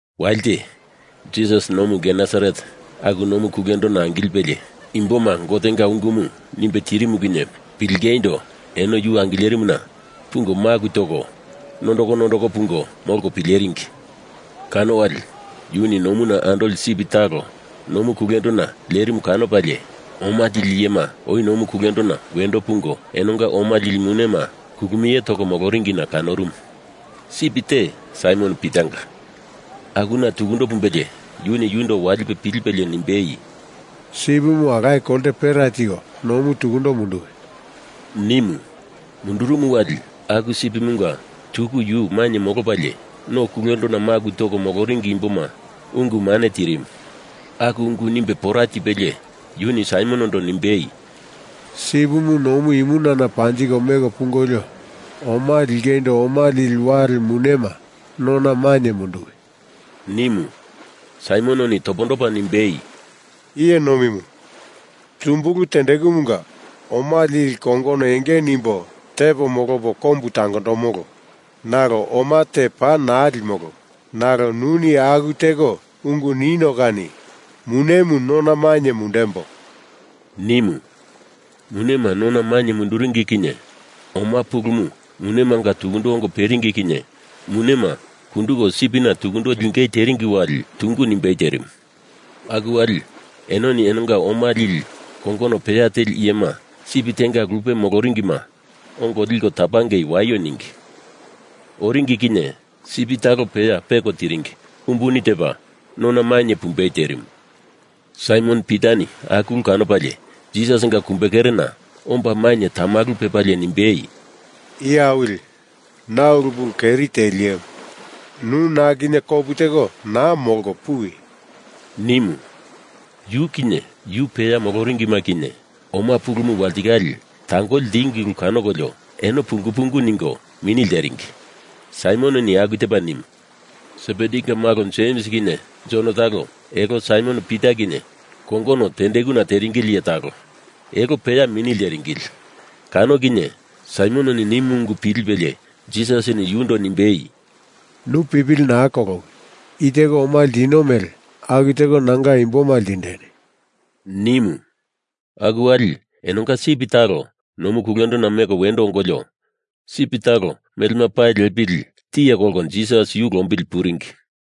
Walite, Jisas nomu Genesaret, aku nomu kulendona angilipe imboma Gotenga ungumu nimbe tirimu kinye pilingeindo eno yu angilerimuna pungo maku toko nondoko nondoko pungo molko pileringi. Kano wali yuni nomuna andoli sip talo nomu kulendona lerimu kanopalie, oma lili iyema oi nomu kulendona wendo pungo enonga oma lili munema kulumie toko moloringina kanorumu. Sip te Saimon Pitanga, akuna tukundo pumbelie yuni yundo walipe pilipelie nimbei, “Sipimu alaye kolte pera tiko nomu tukundo munduwi,” nimu. Mundurumu wali aku sipimunga tuku yu mainye molopalie, no kulendona maku toko moloringi imboma ungu mane tirimu. Aku ungu nimbe pora tipelie yuni Saimonondo nimbei, “Sipimu nomu imunana panjiko meko pungolio oma lingeindo oma lili wale munema nona mainye munduwi,” nimu. Saimononi topondopa nimbei, “Iye nomimu, tumbulu tendekumunga oma lili kongono enge nimbo tepo molopo kombu tangoromolo nalo oma te paa naa limolo. Nalo nuni aku teko ungu nino kani munemu nona mainye mundembo,” nimu. Munema nona mainye munduringi kinye oma pulumu munemanga tukundo ongo peringi kinye munema kunduko sipina tukundo lingei teringi wali tungu nimbei terimu. Aku wali enoni enonga oma lili kongono peya teli iyema, sip tenga lupe moloringima ongo liko tapangei waio ningi. Oringi kinye sip talo peya peko tiringi umbuni tepa nona mainye pumbei terimu. Saimon Pitani aku ulumu kanopalie Jisasinga kumbekerena omba mainye tamalu pepalie nimbei, “Iye Awili, na ulu pulu keri teli iyemu. Nu na kinye kopu teko naa molko, puwi,” nimu. Yu kinye yu peya moloringima kinye oma pulumu walitikale tangoli ltingi ulu kanokolio eno pungu pungu ningo mini lteringi Saimononi aku tepa nimu. Sebedinga malo Jems kinye Jon talo elo Saimon Pita kinye kongono tendekuna teringili iye talo, elo peya mini lteringili. Kano kinye Saimononi nimu ungu pilipelie Jisasini yundo nimbei, “Nu pipili naa kolowi! I teko oma ltino mele aku teko nanga imboma ltindeni,” nimu. Aku wali enonga sip talo nomu kulendona meko wendo ongolio, sip talo melema pali lepili tiye kolko Jisas yu lombili puringi.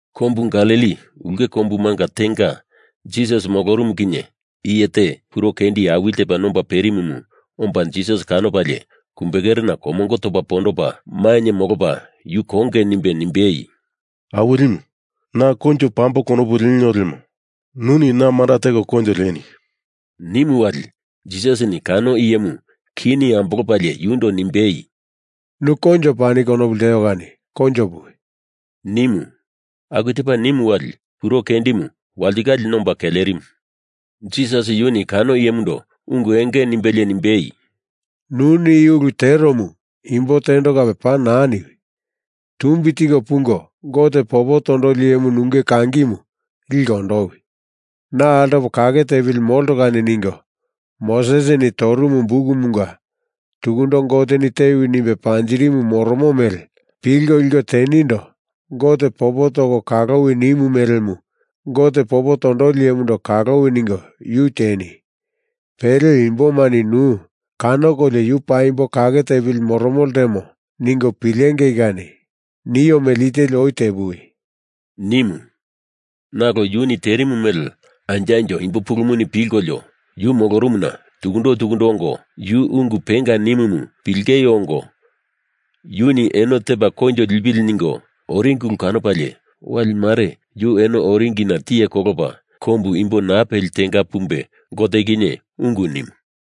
Kombu Galili ulke kombumanga tenga Jisas molorumu kinye iye te kuro kendi awili tepa nomba perimumu omba Jisas kanopalie kumbekerena komongo topa pondopa mainye molopa yu konge nimbe nimbei, “Awilimu, na Koinjo pamboi konopu lenio lemo nuni na manda teko koinjo lieni,” nimu wali Jisasini kano iyemu kini ambolopalie yundo nimbei, “Nu koinjo pani konopu lteo kani koinjo puwi,” nimu. Aku tepa nimu wali kuro kendimu walitikale nomba kelerimu. Jisas yuni kano iyemundo ungu enge nimbelie nimbei, “Nuni i ulu teromu imbo tendo kape paa naa niwi! Tumbi tiko pungo Gote popo tondoli iyemu nunge kangimu liko ondowi. Na altopo kake tepili molto kani, ningo Mosesini torumu bukumunga tukundo Goteni tewi nimbe panjirimu moromo mele pilko liko teniondo Gote popo toko kalowi nimu melemu Gote popo tondoli iyemundo kalowi ningo yu tieni! Pele imbomani nu kanokolio yu paimbo kake tepili moromo ltemo ningo pilengei kani nio mele i teli oi tepuwi,” nimu. Nalo yuni terimu mele anjo anjo imbo pulumuni pilkolio, yu molorumuna tukundo tukundo ongo yu ungu penga nimumu pilengei ongo, yuni eno tepa koinjo lipili ningo oringi ulu kanopalie wali mare yu eno oringina tiye kolopa kombu imbo naa peli tenga pumbe Gote kinye ungu nimu.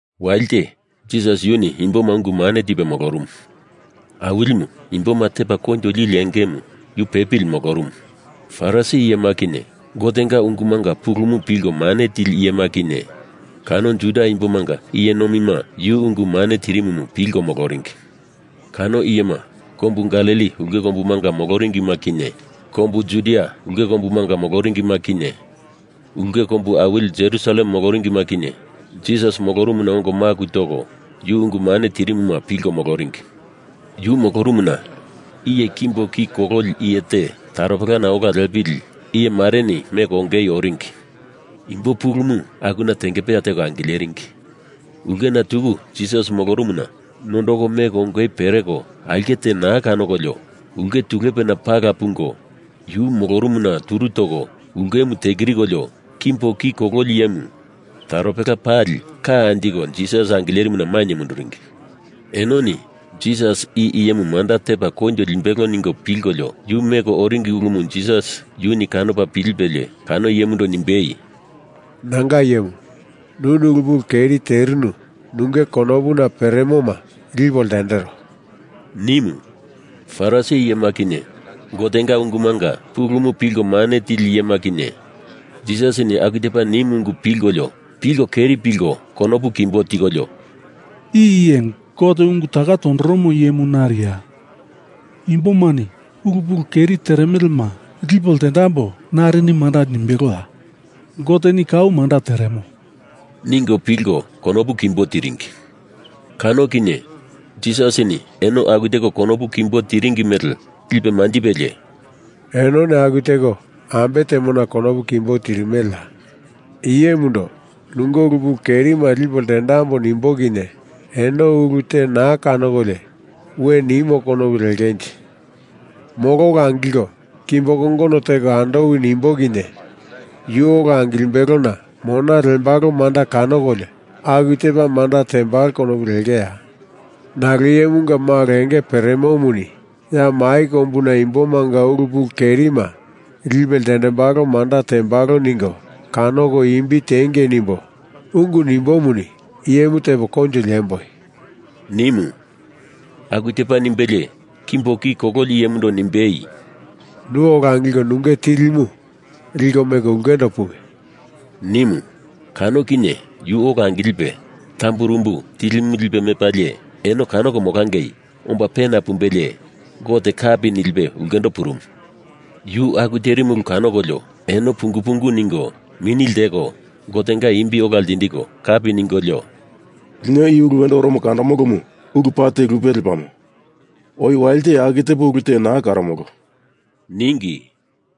Walite Jisas yuni imboma ungu mane tipe molorumu. Awilimu imboma tepa koinjo lili engemu yu pepili molorumu. Farisi iyema kinye, Gotenga ungumanga pulumu pilko mane tili iyema kinye, kano Juda Imbomanga iye nomima yu ungu mane tirimumu pilko moloringi. Kano iyema, kombu Galili ulke kombumanga moloringima kinye, kombu Judia ulke kombumanga moloringima kinye, ulke kombu awili Jerusalem moloringima kinye, Jisas molorumuna ongo maku toko yu ungu mane tirimumu pilko moloringi. Yu molorumuna iye kimbo ki kololi iye te taropelana ola lepili iye mareni meko ongei oringi. Imbo pulumu akuna tengepeya teko angileringi ulkena tuku Jisas molorumuna nondoko meko ongei pereko aulke te naa kanokolio, ulke tulepena pala pungo yu molorumuna turu toko ulkemu tekirikolio kimbo ki kololi iyemu taropela pali ka anjiko Jisas angilerimuna mainye munduringi. Enoni Jisas i iyemu manda tepa koinjo limbelo ningo pilkolio yu meko oringi ulumu Jisas yuni kanopa pilipelie kano iyemundo nimbei, “Nanga iyemu, nuni ulu pulu keri terinu nunge konopuna peremoma lipo ltendero,” nimu. Farisi iyema kinye, Gotenga ungumanga pulumu pilko mane tili iyema kinye, Jisasini aku tepa nimu ungu pilkolio pilko keri pilko konopu kimbo tikolio, “I iye Gote ungu taka tondoromo iyemu nariya? Imbomani ulu pulu keri teremelema lipo ltendambo narini manda nimbeloya? Goteni kau manda teremo,” ningo pilko konopu kimbo tiringi. Kano kinye Jisasini eno aku teko konopu kimbo tiringi mele lipe manjipelie “Enoni aku teko ambe temona konopu kimbo tirimeleya? I iyemundo nunge ulu pulu kerima lipo ltendambo. nimbo kinye eno ulu te naa kanokolio we nimo konopu lengenje? Molo ola angilko kimbo kongono teko andowi nimbo kinye yu ola angilimbelona mona lembalo manda kanokolio aku tepa manda tembalo konopu lengeya? Nalo Iyemunga Malo enge peremomuni ya mai kombuna imbomanga ulu pulu kerima lipe ltendembalo manda tembalo ningo kanoko imbi tiengei nimbo, ungu nimbomuni iyemu tepo koinjo liemboi,” nimu. Aku tepa nimbelie kimbo ki kololi iyemundo nimbei, “Nu ola angilko nunge tilimu, liko meko ulkendo puwi,” nimu. Kano kinye yu ola angilipe tamburumbu tilimu lipe mepalie, eno kanoko molangei omba pena pumbelie Gote kapi nilipe ulkendo purumu. Yu aku terimu ulu kanokolio eno pungu pungu ningo mini lteko Gotenga imbi ola ltindiko kapi ningolio, “Lino i ulu wendo oromo kandomolomu ulu paa te lupe lepamo. Oi walite aku tepo ulu te naa karomolo,” ningi.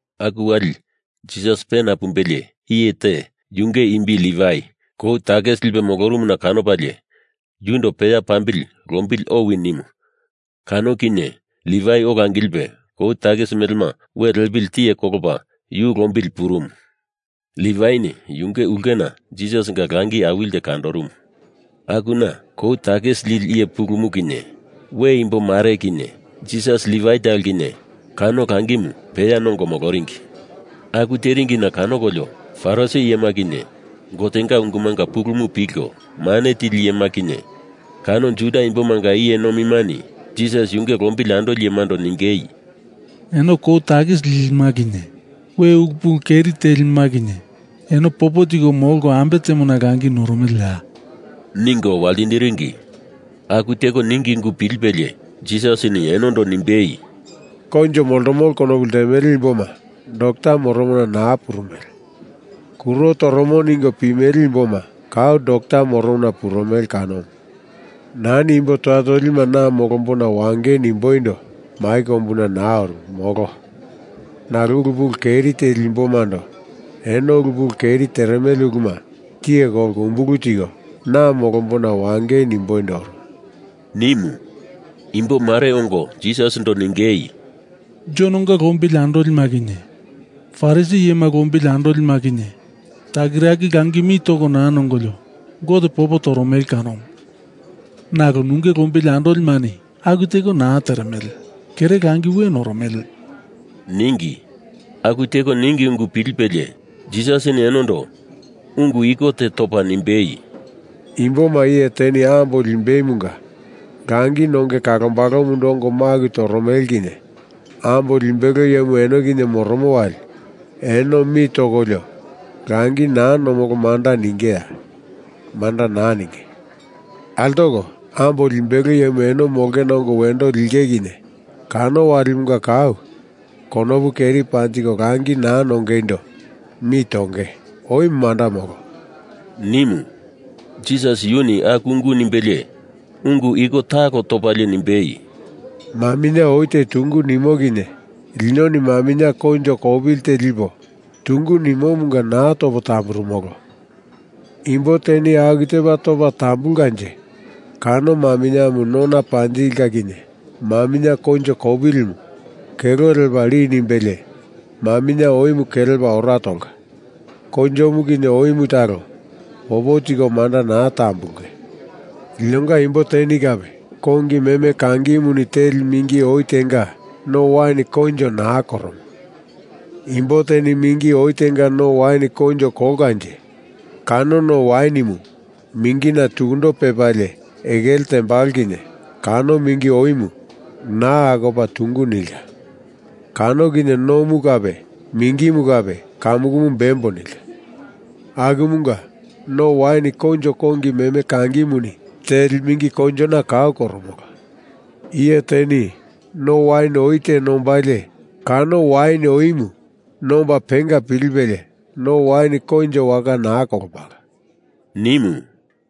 Aku wali Jisas pena pumbelie, iye te, yunge imbi Livai, kou takisi lipe molorumuna kanopalie yundo peya pambili lombili owi nimu kano kinye Livai ola angilipe kou takisi melema we lepili tiye kolopa yu lombili purumu. Livaini yunge ulkena Jisasinga langi awili te kandorumu. Akuna kou takisi lili iye pulumu kinye, we imbo mare kinye, Jisas Livai talo kinye kano langimu peya nongo moloringi. Aku teringina kanokolio Farisi iyema kinye, Gotenga ungumanga pulumu pilko mane tili iyema kinye, kano Juda Imbomanga iye nomimani Jisas yunge lombili andolimando ningei, “Eno kou takisi lilima kinye we ulu pulu keri telima kinye eno popo tiko molko ambe temona langi noromeleya?” ningo waltindiringi. Aku teko ningi ungu pilipelie Jisasini enondo nimbei, “Koinjo moltomolo konopu ltemele imboma dokta moromona naa purumele. Kuro toromo ningo pimele imboma kau dokta moromona purumele kanomu. Nani imbo toya tolima na molombona wangei nimboindo mai kombuna naa oru, molo. Nalo ulu pulu keri teli imbomando eno ulu pulu keri teremele uluma tiye kolko umbulu tiko na molombona wangei nimboindo oru,” nimu. Imbo mare ongo Jisasindo ningei, “Jononga lombili andolima kinye Farisi iyema lombili andolima kinye takiraki langi mi toko naa nongolio Gote popo toromele kanomu. Nalo nunge lombili andolimani aku teko naa teremele, kere langi we noromele,” ningi. Aku teko ningi ungu pilipelie Jisasini enondo ungu iko te topa nimbei, “Imboma iye teni ambo limbeimunga langi nonge kalombalomundo ongo maku toromele kinye ambo limbelo iyemu eno kinye moromo wali eno mi tokolio langi naa nomolo manda ningeya? Manda naa ninge. Altoko, ambo limbelo iyemu eno molongena ongo wendo linge kinye kano walimanga kau, konopu keri panjiko langi naa nongeindo mi tonge. Oi manda molo,” nimu. Jisas yuni aku ungu nimbelie, ungu iko talo topalie nimbei, “Maminye oi te tungu nimo kinye linoni maminye koinjo kopili te lipo tungu nimomunga naa topo tamburumolo. Imbo teni aku tepa topa tambulkanje kano maminyemu nona panjinge kinye maminye koinjo kopilimu kelo lepa li nimbelie maminye oimu kelepa ora tolka. Koinjomu kinye oimu talo popo tiko manda naa tambulunge. Linonga imbo teni kape kongi meme kangimuni teli mingi oi tenga no wain koinjo naa koromo. Imbo teni mingi oi tenga no wain koinjo kolkanje kano no wainimu mingina tukundo pepalie ekele tembalo kinye kano mingi oimu naa akopa tungu nilka. Kano kinye nomu kape mingimu kape kamukumu bembo nilka. Akumunga no wain koinjo kongi meme kangimuni teli mingi koinjona kau koromolo. Iye teni no wain oi te nombalie kano wain oimu nomba penga pilipelie no wain koinjo waka naa kolombalo,” nimu.